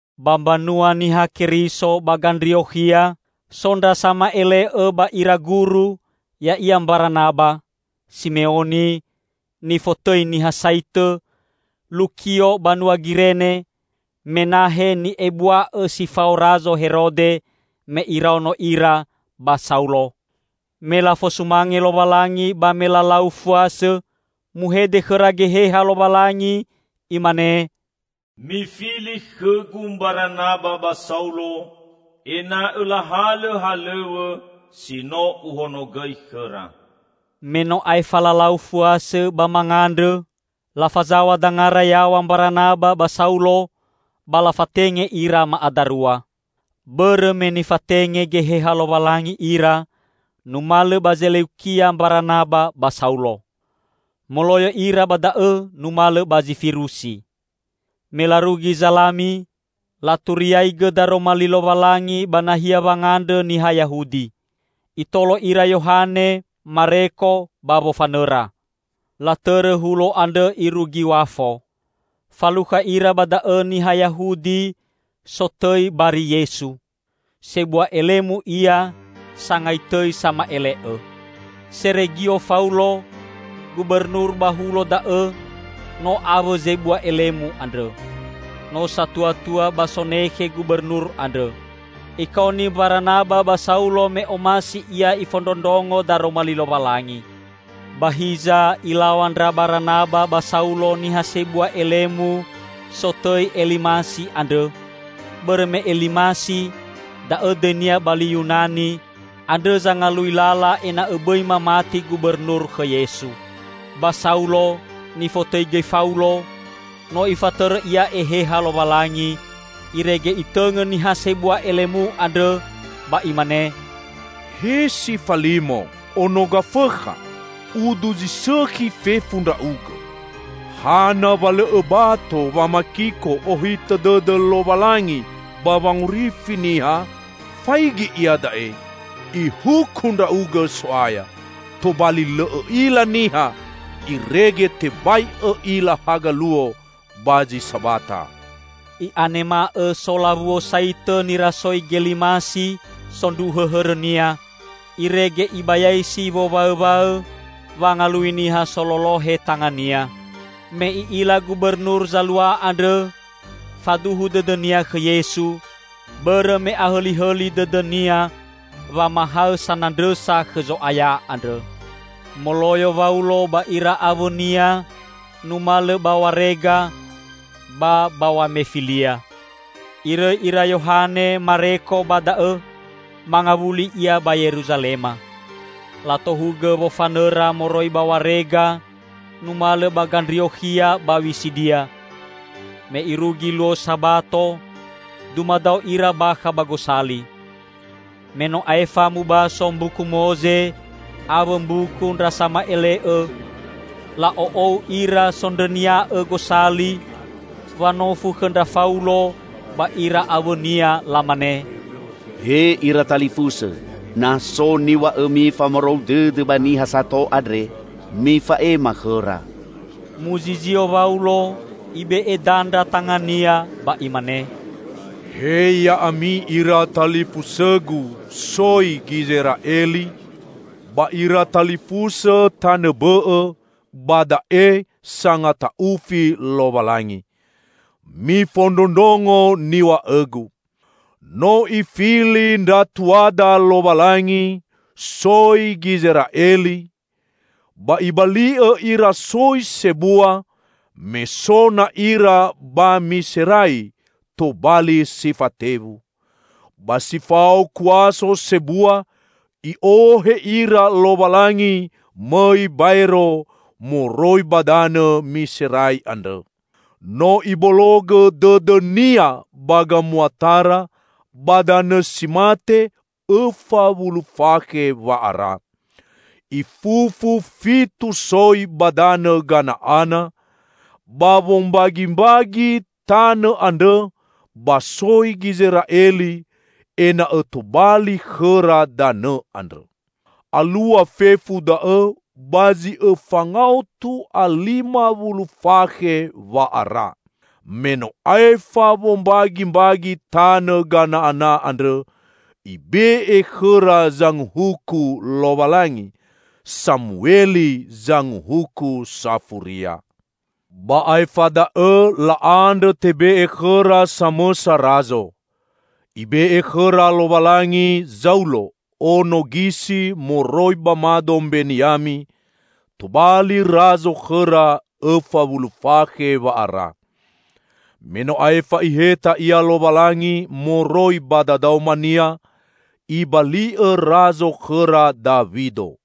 Ba mbanua Niha Keriso ba Gandriokhia, so ndra sama'ele'õ ba ira guru, ya'ia Mbaranaba, Simeoni nifotõi Niha Saitõ, Lukio banua Girene, Menahe ni'ebua'õ si fao Razo Herode me iraono ira, ba Saulo. Me lafosumange Lowalangi ba me lalau fuasõ, muhede khõra Geheha Lowalangi, imane, "Mifili khõgu Mbaranaba ba Saulo, ena'õ lahalõ halõw̃õ si no Uhonogõi khõra." Me no aefa lalau fuasõ ba mangandrõ, lafazaw̃a dangara yaw̃a Mbaranaba ba Saulo ba lafatenge ira ma'adarua. Bõrõ me nifatenge Geheha Lowalangi ira, numalõ ba Zeleukia Mbaranaba ba Saulo. Moloyo ira ba da'õ numalõ ba Zifirusi. Me larugi Zalami, laturiaigõ Daroma Li Lowalangi ba nahia wangandrõ niha Yahudi. Itolo ira Yohane Mareko ba wofanõra. Latõrõ hulo andrõ irugi Wafo. Falukha ira ba da'õ niha Yahudi sotõi Bari Yesu. Sebua elemu ia sangai tõi sama'ele'õ. Seregio Faulo, gubernur ba hulo da'õ no awõ zebua elemu andrõ. No satuatua ba sonekhe gubernur andrõ. Ikaoni Mbaranaba ba Saulo me omasi ia ifondrondrongo Daroma Li Lowalangi. Ba hiza ilaw̃a ndra Baranaba ba Saulo niha sebua elemu sotõi Elimasi andrõ, bõrõ me Elimasi (da'õ dõinia ba li Yunani) andrõ zangalui lala ena'õ bõi mamati gubernur khõ Yesu. Ba Saulo -- nifotõi gõi Faulo -- no Ifatõrõ ia Eheha Lowalangi, irege itõngõ niha sebua elemu andrõ, ba imane, "He si falimo, ono Gafõkha! Udu zi sõkhi fefu ndra'ugõ. Hana wa lõ õbato wamakiko ohitõ dõdõ Lowalangi ba wangorifi niha? Faigi iada'e, Ihuku ndra'ugõ So'aya! Tobali lõ õ'ila niha, irege tebai õ'ila haga luo ba zi sabata." I'anema'õ so lawuo saitõ nirasoi Gelimasi sondruhõ hõrõnia, irege ibayaisi wowaõwaõ wangalui niha sololohe tangania. Me i'ila gubernur zalua andrõ, faduhu dõdõnia khõ Yesu; bõrõ me ahõlihõli dõdõnia wamahaõ sanandrõsa khõ Zo'aya andrõ. Moloyo Waulo ba ira awõnia numalõ ba Warega ba ba Wamefilia. Irõi ira Yohane Mareko ba da'õ, mangawuli ia ba Yeruzalema. Latohugõ wofanõra moroi ba Warega numalõ ba Gandriokhia ba Wisidia. Me irugi luo Sabato dumadao ira bakha ba gosali. Me no aefa mubaso Mbuku Moze awõ Mbuku ndra Sama'ele'õ, la'o'ou ira sondrõnia'õ gosali wanofu khõ ndra Faulo ba ira awõnia lamane, "He ira talifusõ, na so niw̃a'õmi famarou dõdõ ba niha sato andre, mifa'ema khõra." Muzizio Waulo, ibe'e dandra tangania, ba imane, "He ya'ami ira talifusõgu soi Gizera'eli ba ira talifusõ tanõ bõ'õ ba da'e sangata'ufi Lowalangi! Mifondrondrongo niw̃a'õgu: No Ifili ndra tuada Lowalangi soi Gizera'eli, ba Ibali'õ ira soi sebua me so na ira ba Miserai tobali si fatewu. Ba si fao kuaso sebua I'ohe ira Lowalangi mõi baero moroi ba danõ Miserai andrõ. No Ibologõ dõdõ-Nia ba gamuatara ba danõ si mate õfa wulu fakhe wa'ara. Ifufu fitu soi ba danõ Gana'ana ba wombagimbagi tanõ andrõ ba soi Gizera'eli ena'õ tobali khõra danõ andrõ. Alua fefu da'õ ba zi õfa ngaotu a lima wulu fakhe wa'ara. Me no aefa wombagimbagi tanõ Gana'ana andrõ, Ibe'e khõra zanguhuku Lowalangi. Samueli zanguhuku safuria. Ba aefa da'õ la'andrõ tebe'e khõra samõsa Razo. Ibe'e khõra Lowalangi Zaulo, ono Gisi moroi ba mado Mbeniami, tobali Razo khõra õfa wulu fakhe wa'ara. Me no aefa Iheta ia Lowalangi moroi ba dadaomania, Ibali'õ Razo khõra Dawido.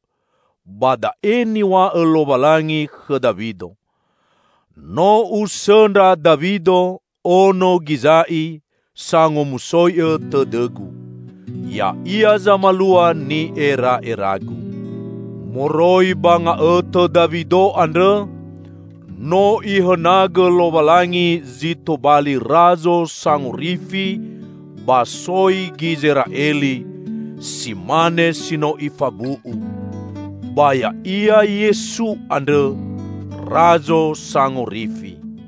Ba da'e niw̃a'õ Lowalangi khõ Dawido, 'No Usõndra Dawido ono Giza'i sangomusoi'õ tõdõ-Gu. Ya'ia zamalua ni'era'era-Gu.' Moroi ba nga'õtõ Dawido andrõ no Ihõnagõ Lowalangi zi tobali Razo Sangorifi ba soi Gizera'eli, si mane si no Ifabu'u. Ba Ya'ia Yesu andrõ Razo Sangorifi.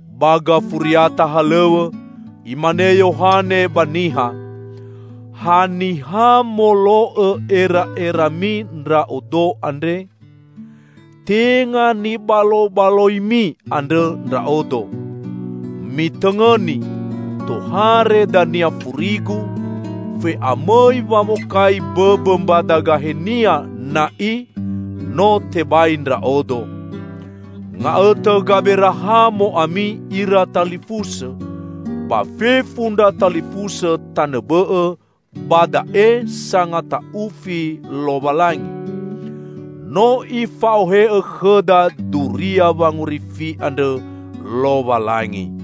Ba gafuriata halõw̃õ, imane Yohane ba niha, 'Haniha molo'õ era'erami ndra'odo andre? Tenga nibalobaloimi andrõ ndra'odo. Mitõngõni, tohare dania furigu; fe'amõi wamokai bõbõ mbadagahenia na'i no tebai ndra'odo.' Nga'õtõ Gaberahamo ami ira talifusõ, ba fefu ndra talifusõ tanõ bõ'õ ba da'e sangata'ufi Lowalangi! No Ifa'ohe'õ khõda duria wangorifi andrõ Lowalangi;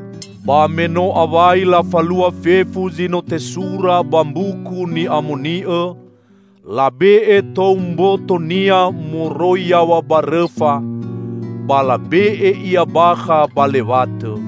Ba me no awai lafalua fefu zi no tesura ba Mbuku Ni'amoni'õ, labe'e tou mboto-Nia moroi yaw̃a ba rõfa, ba labe'e Ia bakha ba lewatõ.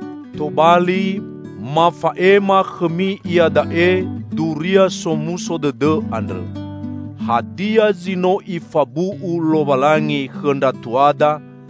Tobali, mafa'ema khõmi iada'e Duria Somuso Dõdõ andrõ: Hadia zi no Ifabu'u Lowalangi khõ ndra tuada,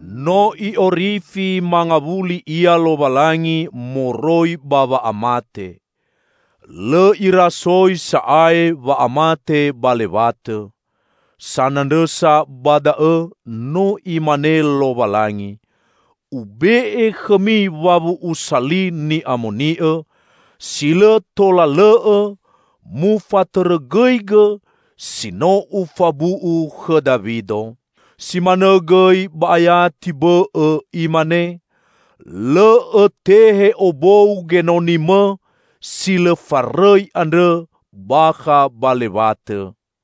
No I'orifi mangawuli Ia Lowalangi moroi ba wa'amate. Lõ irasoi sa'ae wa'amate ba lewatõ. Sanandrõsa ba da'õ no Imane Lowalangi, 'Ube'e khõmi wawu'usa li Ni'amoni'õ, si lõ tola lõ'õ mufatõrõgõigõ, si no Ufabu'u khõ Dawido.' Si manõ gõi ba ayati bõ'õ imane, 'Lõ Õtehe obou Genoni-Mõ si lõ farõi andrõ bakha ba lewatõ.'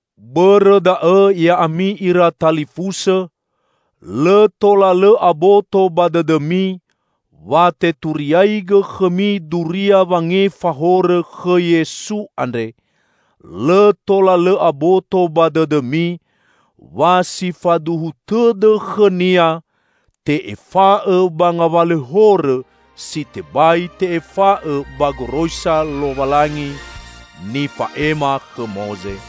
Bõrõ da'õ ya'ami ira talifusõ, lõ tola lõ aboto ba dõdõmi wa teturiaigõ khõmi duria wangefa horõ khõ Yesu andre; lõ tola lõ aboto ba dõdõmi, wa si faduhu tõdõ khõ-Nia, te'efa'õ ba ngawalõ horõ si tebai te'efa'õ ba goroisa Lowalangi nifa'ema khõ Moze.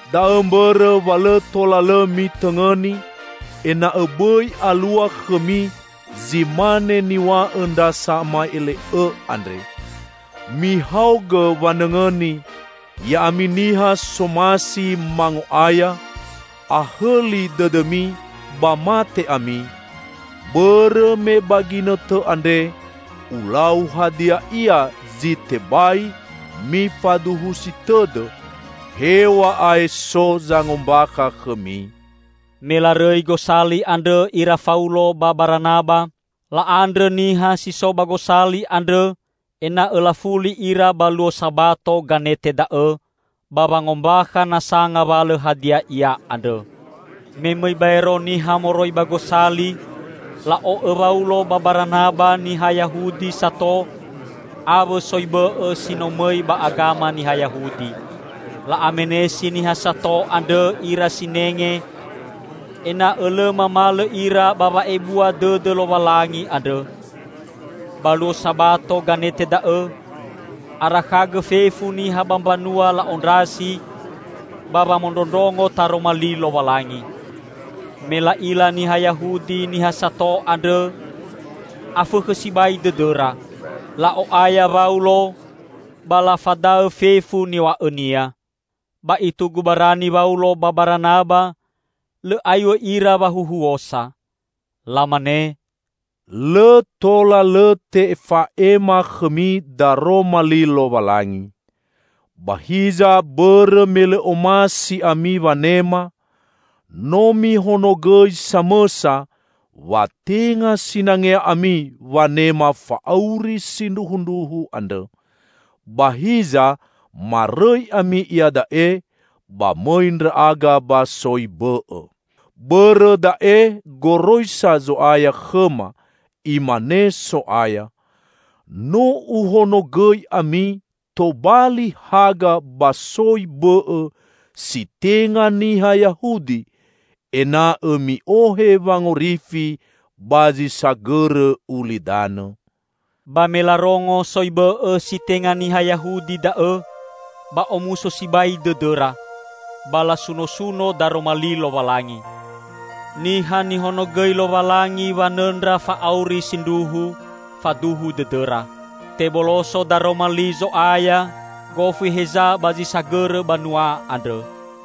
Da'õ mbõrõ wa lõ tola lõ mitõngõni, ena'õ bõi alua khõmi zi mane niw̃a'õ ndra sama'ele'õ andre, 'Mihaogõ wanõngõni, ya'ami niha somasi mango'aya! Ahõli dõdõmi ba mate ami! Bõrõ me ba ginõtõ andre Ulau hadia ia zi tebai mifaduhusi tõdõ, hew̃a'ae so zangombakha khõmi.'" Me larõi gosali andrõ ira Faulo ba Baranaba, la'andrõ niha si so ba gosali andrõ ena'õ lafuli ira ba luo Sabato ganete da'õ, ba wangombakha nasa ngawalõ hadia ia andrõ. Me mõi baero niha moroi ba gosali, la'o'õ Waulo ba Baranaba niha Yahudi sato awõ soi bõ'õ si no mõi ba agama niha Yahudi. La'amenesi niha sato andrõ ira sinenge ena'õ lõ mamalõ ira ba wa'ebua dõdõ Lowalangi andrõ. Ba luo Sabato ganete da'õ, arakhagõ fefu niha ba mbanua la'ondrasi ba wamondrondrongo Taroma Li Lowalangi. Me la'ila niha Yahudi niha sato andrõ, afõkhõ sibai dõdõra. La'o'aya Waulo ba lafadaõ fefu niw̃a'õnia. Ba itugu barani Waulo ba Baranaba, lõ aiw̃õ ira wahuhuosa. Lamane, "Lõ tola lõ tefa'ema khõmi Daroma Li Lowalangi. Ba hiza bõrõ me lõ omasi ami wanema, no mihonogõi samõsa wa tenga sinangea ami wanema fa'auri sindruhundruhu andrõ. Ba hiza marõi ami iada'e ba mõi ndra'aga ba soi bõ'õ. Bõrõ da'e goroisa Zo'aya khõma; imane So'aya, 'No Uhonogõi ami tobali haga ba soi bõ'õ si tenga niha Yahudi, ena'õ mi'ohe wangorifi ba zi sagõrõ ulidanõ.'" Ba me larongo soi bõ'õ si tenga niha Yahudi da'õ, ba omuso sibai dõdõra, ba lasunosuno Daroma Li Lowalangi. Niha nihonogõi Lowalangi wanõndra fa'auri sindruhu, faduhu dõdõra. Teboloso Daroma Li Zo'aya gofu heza ba zi sagõrõ banua andrõ.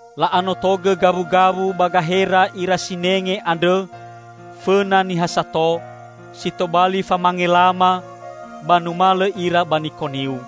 La'anotogõ gawugawu ba gahera ira sinenge andrõ fõna niha sato si tobali famangelama, ba numalõ ira ba Nikoniu.